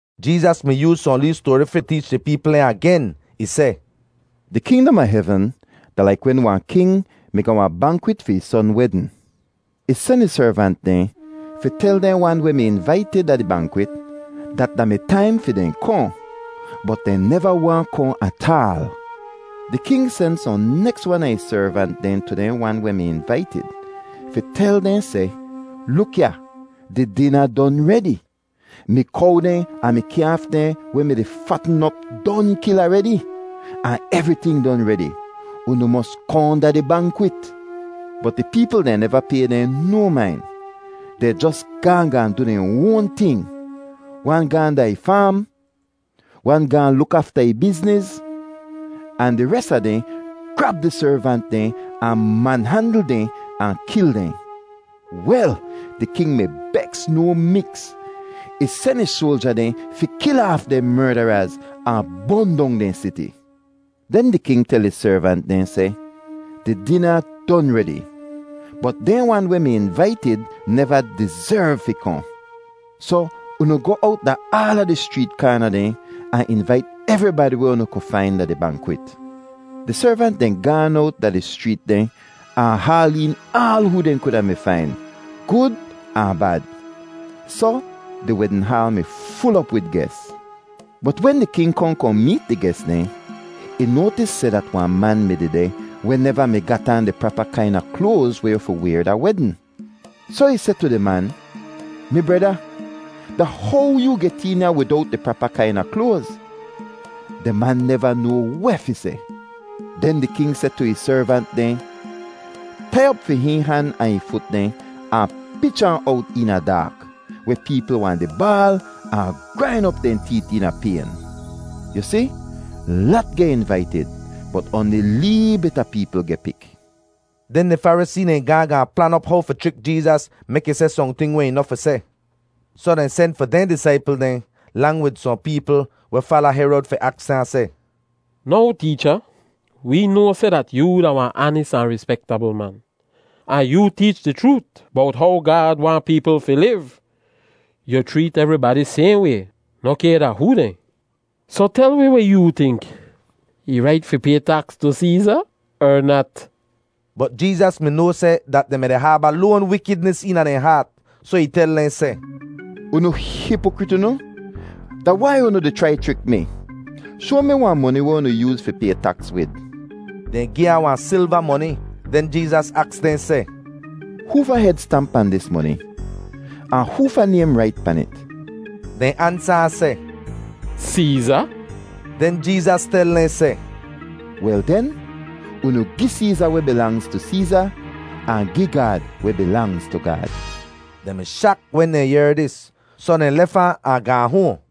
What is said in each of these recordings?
Jeezas mi yooz sohn lee stoari fi teech di peepl dehn agen. Ih seh, “Di kingdom a hevn da laik wen wahn king mi ga wahn bankwit fi ih son wedn. Ih sen ih servant dehn fi tel dehn wan weh mi invaitid da di bankwit dat da mi taim fi dehn kohn, bot dehn neva waahn kohn ataal. “Di king sen sohn neks wan a ih servant dehn tu dehn wan weh mi invaitid fi tel dehn seh, ‘Luk ya, di dina don redi. Mi kow dehn ahn mi kyaaf dehn weh mi-di fatn op don kil aredi ahn evriting don redi; unu mos kohn da di bankwit.’ “Bot di peepl dehn neva pay dehn no main; dehn jos gaahn gaahn du dehn oan ting. Wan gaahn da ih faam, wan gaahn luk afta ih bizniz, ahn di res a dehn grab di servant dehn ahn manhandl dehn ahn kil dehn. Wel, di king mi beks no miks! Ih sen ih soalja dehn fi kil aaf dehn merdaraz, ahn bon dong dehn siti. “Den di king tel ih servant dehn seh, ‘Di dina don redi, bot dehn wan weh mi invaitid neva dizerv fi kohn. Soh unu goh owt da aala di schreet kaana dehn ahn invait evribadi weh unu ku fain da di bankwit.’ Di servant dehn gaan owt da di schreet dehn ahn haal een aal hoo dehn kuda mi fain, gud ahn bad; soh di wedn haal mi ful op wid ges. “Bot wen di king kohn kohn meet di ges dehn, ih noatis seh dat wahn man mi dehdeh weh neva mi gat aan di prapa kaina kloaz weh yu fi wayr da wedn. Soh ih seh tu di man, ‘Mi breda, da how yoo get een ya widowt di prapa kaina kloaz?’ Di man neva noa weh fi seh. Den di king seh tu ih servant dehn, ‘Tai op fi hihn han ahn ih fut dehn ahn pich ahn owt eena daak, weh peepl wahn di baal ahn grain op dehn teet eena payn.’ “Yu si, lat geh invaitid bot oanli lee bit a peepl geh pik.” Den di Farisee dehn gaahn gaahn plan op how fi chrik Jeezas mek ih seh sohnting weh ih noh fi seh. Soh dehn sen fi dehn disaipl dehn lang wid sohn peepl weh fala Herod fi aks ahn seh, “Now Teecha, wee noa seh dat yoo da wahn aanis ahn rispektabl man, ahn yoo teech di chroot bowt how Gaad waahn peepl fi liv. Yu chreet evribadi sayhn way noh kay da hoo dehn. Soh tel wi weh yoo tink. Ih rait fi pay taks tu Seeza er nat?” Bot Jeezas mi noa seh dat dehn mi-di haaba loan wikidnis eena dehn haat, soh ih tel dehn seh, “Unu hipokrit unu! Da wai unu di chrai chrik mi? Shoa mi wahn moni weh unu yooz fi pay taks wid.” Dehn gi ahn wahn silva moni. Den Jeezas aks dehn seh, “Hoofa hed stamp pahn dis moni, ahn hoofa naym rait pan it?” Dehn ansa ahn seh, “Seeza.” Den Jeezas tel dehn seh, “Wel den, unu gi Seeza weh bilangz tu Seeza, ahn gi Gaad weh bilangz tu Gaad.” Dehn mi shak wen dehn yehr dis, soh dehn lef ahn, ahn gaahn hoahn.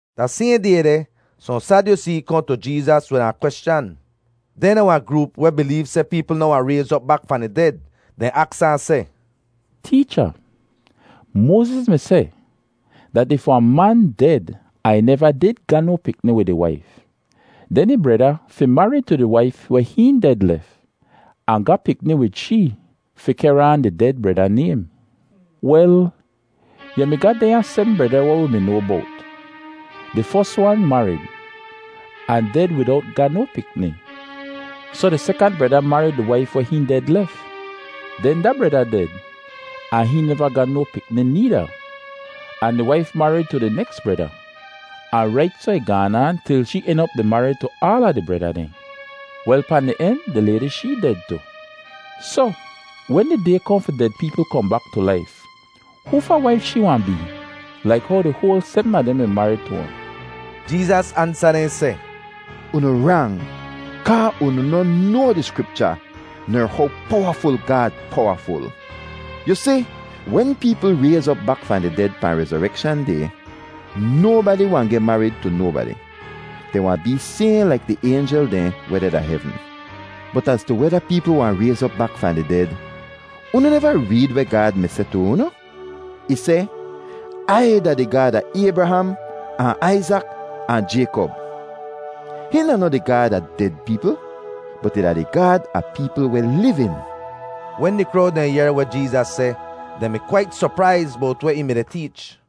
Da sayhn day deh, sohn Sadyusee kohn tu Jeezas wid wahn kweschan. Dehn da wahn groop weh bileev seh peepl noh wahn rayz op bak fahn di ded. Dehn aks ahn seh, “Teecha, Moaziz mi seh dat if wahn man ded ahn ih neva did ga no pikni wid ih waif, den ih breda fi marid tu di waif weh hihn ded lef, ahn ga pikni wid shee fi kehr aan di ded breda naym. Wel, yu mi ga dehnya sebm breda weh wi mi noa bowt. Di fos wan marid ahn ded widowt ga no pikni, soh di sekant breda marid di waif weh hihn ded lef. Den da breda ded ahn hihn neva ga no pikni needa, ahn di waif marid tu di neks breda, ahn rait soh ih gaan aan til shee en op di marid tu aala di breda dehn. Wel, pahn di en di laydi shee ded tu. Soh, wen di day kohn fi ded peepl kohn bak tu laif, hoofa waif shee wahn bee, laik how di hoal sebm a dehn mi marid tu ahn?” Jeezas ansa dehn seh, “Unu rang kaa unu noh noa di Skripcha ner how powaful Gaad powaful. Yu si, wen peepl rayz op bak fahn di ded pahn rezorekshan day, nobadi wahn geh marid tu nobadi. Dehn wahn bee sayhn laik di aynjel dehn weh deh da hevn. Bot az tu weda peepl wahn rayz op bak fahn di ded, unu neva reed weh Gaad mi seh tu unu? Ih seh, ‘Ai da di Gaad a Aybraham ahn Aizak ahn Jaykop.’ Hihn da noh di Gaad a ded peepl, bot ih da di Gaad a peepl weh livin.” Wen di krowd dehn yehr weh Jeezas seh, dehn mi kwait sopraiz bowt weh ih mi-di teech.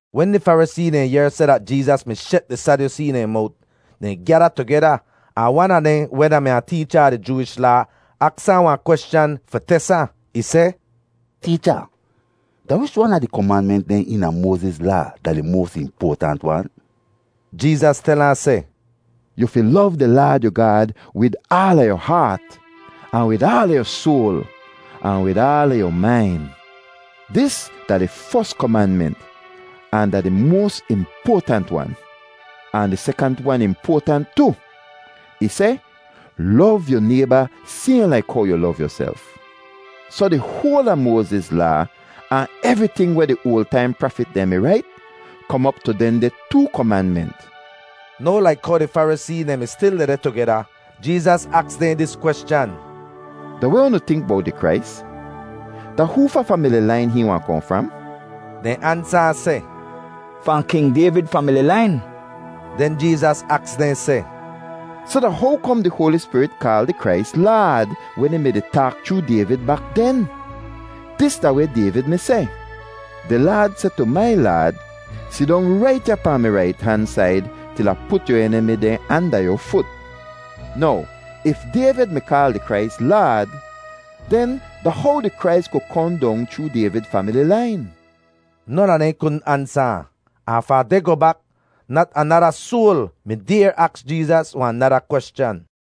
Wen di Farisee dehn yehr seh dat Jeezas mi shet di Sadyusee dehn mowt, dehn gyada tugeda, ahn wan a dehn weh da-mi wahn teecha a di Jooish Laa aks ahn wahn kweschan fi tes ahn. Ih seh, “Teecha, da wich wan a di komanment dehn eena Moaziz Laa da di moas impoatant wan?” Jeezas tel ahn seh, “‘Yu fi lov di Laad yu Gaad wid aala yu haat, ahn wid aala yu soal, ahn wid aala yu main.’ Dis da di fos komanment ahn da di moas impoatant wan. Ahn di sekant wan impoatant tu. Ih seh, ‘Lov yu nayba sayhn laik how yu lov yuself.’ Soh di hoal a Moaziz Laa, ahn evriting weh di oal taim prafit dehn mi rait, kom op tu dehndeh too komanment.” Now laik how di Farisee dehn mi stil dehdeh tugeda, Jeezas aks dehn dis kweschan, “Da weh unu tink bowt di Krais? Da hoofa famili lain hihn wahn kohn fram?” Dehn ansa ahn seh, “Fahn King Dayvid famili lain.” Den Jeezas aks dehn seh, “Soh da how kom di Hoali Spirit kaal di Krais ‘Laad’ wen ih mi-di taak chroo Dayvid bak den? Dis da weh Dayvid mi seh: ‘Di Laad seh tu mai Laad, “Sidong rait ya pahn mi rait han said til Ah put yu enimi dehn anda yu fut.”’ Now if Dayvid mi kaal di Krais ‘Laad,’ den da how di Krais ku kohn dong chroo Dayvid famili lain?” Non a dehn kudn ansa ahn, ahn fahn deh goh bak nat anada soal mi dayr aks Jeezas wahn nada kweschan.